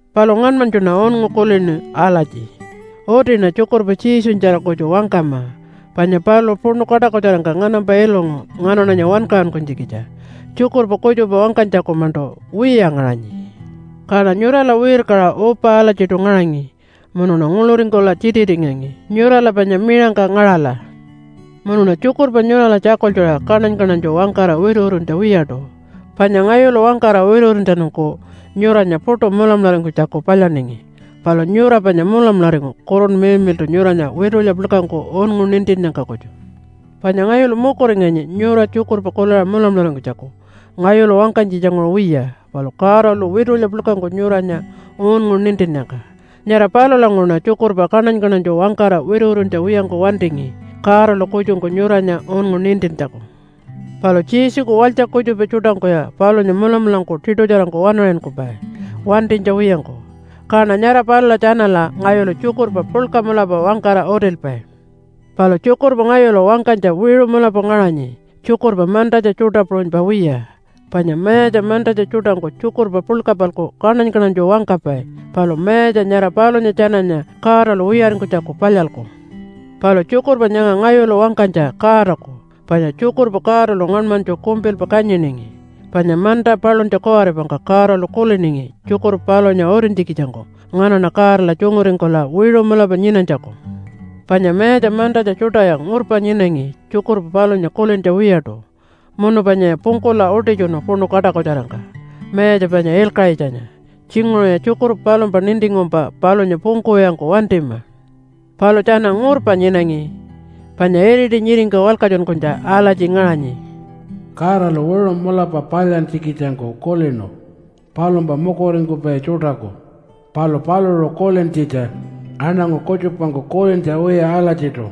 Palu ngaṉmanytjuṉa unngu kulinu alatji, “Utiṉa tjukurpa Jesunyatjara kutju wangkama, panya paluṟu puṉu kaṯakutjarangka nganampa ilungu nganaṉanya wankaṟunkunytjikitja. Tjukurpa kutjupa wangkanytjaku-maṉṯu wiya ngaṟanyi.” Kaṉa nyurala wirkaṟa upa alatjiṯu ngaṟangi munuṉa nguḻuringkula tjititingangi nyurala panya miṟangka ngaṟala. Munuṉa tjukurpa nyurala tjakultjuṟa kaṉany-kaṉanytju wangkara wituwituntja wiyaṯu. Panya ngayulu wangkara wituwituntjatjanungku nyuranya puṯu mulamularingkunytjaku palyaningi. Palu nyura panya mulamularingu Kurunpa Miḻmiḻṯu nyuranya witulya puḻkangku unngu nintinnyangka kutju. Panya ngayulu mukuringangi nyura tjukurpa kuliṟa mulamularingkunytjaku ngayulu wangkanytjitjanguṟu wiya, palu Godalu witulya puḻkangku nyuranya unngu nintinnyangka. Nyara palulanguṟuṉa tjukurpa kaṉany-kaṉanytju wangkara wituwituntja wiyangku wantingi, Godalu kutjungku nyuranya unngu nintintjaku. Palu Jesuku walytja kutjupa tjuṯangkuya palunya mulamulangku tiṯutjarangku waṉaṟinkupai wantinytja wiyangku. Kaṉa nyara palula tjanala ngayulu tjukurpa puḻka mulapa wangkara utilpai. Palu tjukurpa ngayulu wangkanytja wiṟu mulapa ngaṟanyi, tjukurpa mantatja tjuṯa puṟunypa wiya. Panya mayatja mantatja tjuṯangku tjukurpa puḻka-palku kaṉany-kaṉanytju wangkapai. Palu mayatja nyara palunya tjananya Godalu wiyaringkunytjaku palyalku. Palu tjukurpa nyanga ngayulu wangkanytja Godaku, panya tjukurpa Godalu ngaṉmanytju kumpilpa kanyiningi. Panya manta paluntja kuwaripangka Godalu kuliningi tjukurpa palunya utintjikitjangku nganaṉa Godala tjunguringkula wiṟu mulapa nyinanytjaku. Panya mayatja mantatja tjuṯaya ngurpa nyinangi tjukurpa palunya kulintja wiyaṯu, munu panyaya pungkula utitjunu puṉu kaṯakutjarangka, Mayatja panya Ilkaṟitjanya. Tjinguṟuya tjukurpa palumpa nintingkumpa palunya pungkuwiyangku wantima. Palu tjana ngurpa nyinangi, panya iriti nyiringka walkatjunkunytja alatji ngaṟanyi, “Godalu wiṟu mulapa palyantjikitjangku kulinu palumpa mukuringkupai tjuṯaku, palu paluṟu kulintjitja aṉangu kutjupangku kulintja wiya alatjiṯu.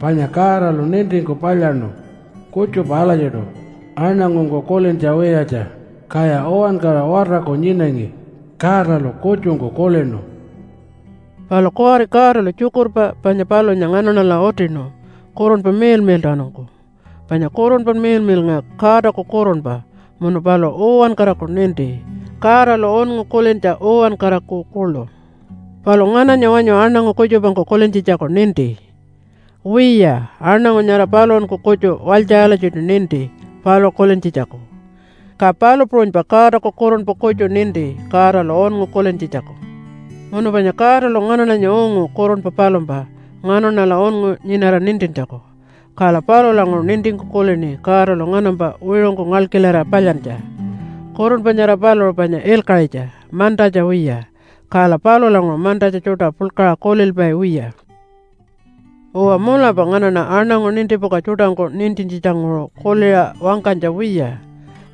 Panya Godalu nintingku palyaṉu kutjupa alatjiṯu aṉangungku kulintja wiyatja. Kaya uwankara watarku nyinangi, Godalu kutjungku kulinu.” Palu kuwari Godalu tjukurpa panya palunya nganaṉala utinu Kurunpa Miḻmiḻṯawanungku. Panya Kurunpa Miḻmiḻnga Godaku kurunpa munu paluṟu uwankaraku ninti, Godalu unngu kulintja uwankaraku kuḻu. Palu ngananya wanyu aṉangu kutjupangku kulintjitjaku ninti? Wiya, aṉangu nyara paluṟunku kutju walytja alatjiṯu ninti paluṟu kulintjitjaku. Ka palu puṟunypa Godaku Kurunpa kutju ninti Godalu unngu kulintjitjaku. Munu panya Godalu nganaṉanya ungu kurunpa palumpa nganaṉala unngu nyinara nintintjaku, kala palulanguṟu nintingku kulini Godalu nganampa wiṟungku ngalkilarira palyantja. Kurunpa nyara paluṟu panya ilkaṟitja, mantatja wiya, kala palulanguṟu mantatja tjuṯa puḻkaṟa kulilpai wiya. Uwa, mulapa nganaṉa aṉangu nintipuka tjuṯangku nintintjitjanguṟu kuliṟa wangkanytja wiya,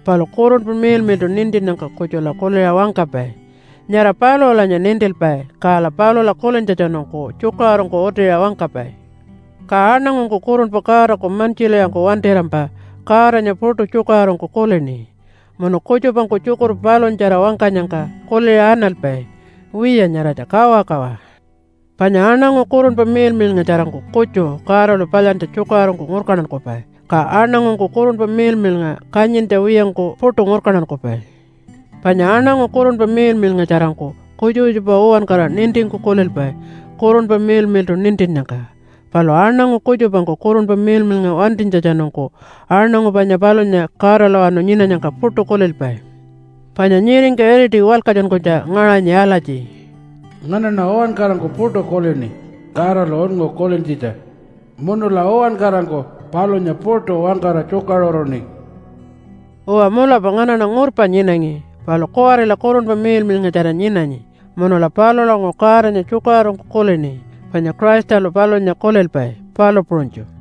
palu Kurunpa Miḻmiḻṯu nintinnyangka kutjula kuliṟa wangkapai. Nyara paluṟulanya nintilpai kala palula kulintjatjanungku tjukaṟurungku utiṟa wangkapai. Ka aṉangungku Kurunpa Godaku mantjilwiyangku wantirampa Godanya puṯu tjukaṟurungku kulini, munu kutjupangku tjukurpa palunyatjara wangkanyangka kuliṟa analpai, “Wiya, nyaratja kawakawa.” Panya aṉangu Kurunpa Miḻmiḻngatjarangku kutju Godalu palyantja tjukaṟurungku ngurkantankupai, ka aṉangungku Kurunpa Miḻmiḻnga kanyintja wiyangku puṯu ngurkantankupai. Panya aṉangu Kurunpa Miḻmiḻngatjarangku kutjupa kutjupa uwankara nintingku kulilpai Kurunpa Miḻmiḻṯu nintinnyangka. Palu aṉangu kutjupangku Kurunpa Miḻmiḻnga wantinytjatjanungku aṉangu panya palunya Godalawanu nyinanyangka puṯu kulilpai. Panya nyiringka iriti walkatjunkunytja ngaṟanyi alatji, “Nganaṉa uwankarangku puṯu kulini Godalu unngu kulintjitja. Munula uwankarangku palunya puṯu wangkara tjukaṟuruṉi.” Uwa mulapa nganaṉa ngurpa nyinangi, palu kuwarila Kurunpa Miḻmiḻngatjara nyinanyi munula palulanguṟu Godanya tjukaṟurungku kulini, panya Christalu palunya kulilpai, palu puṟunytju.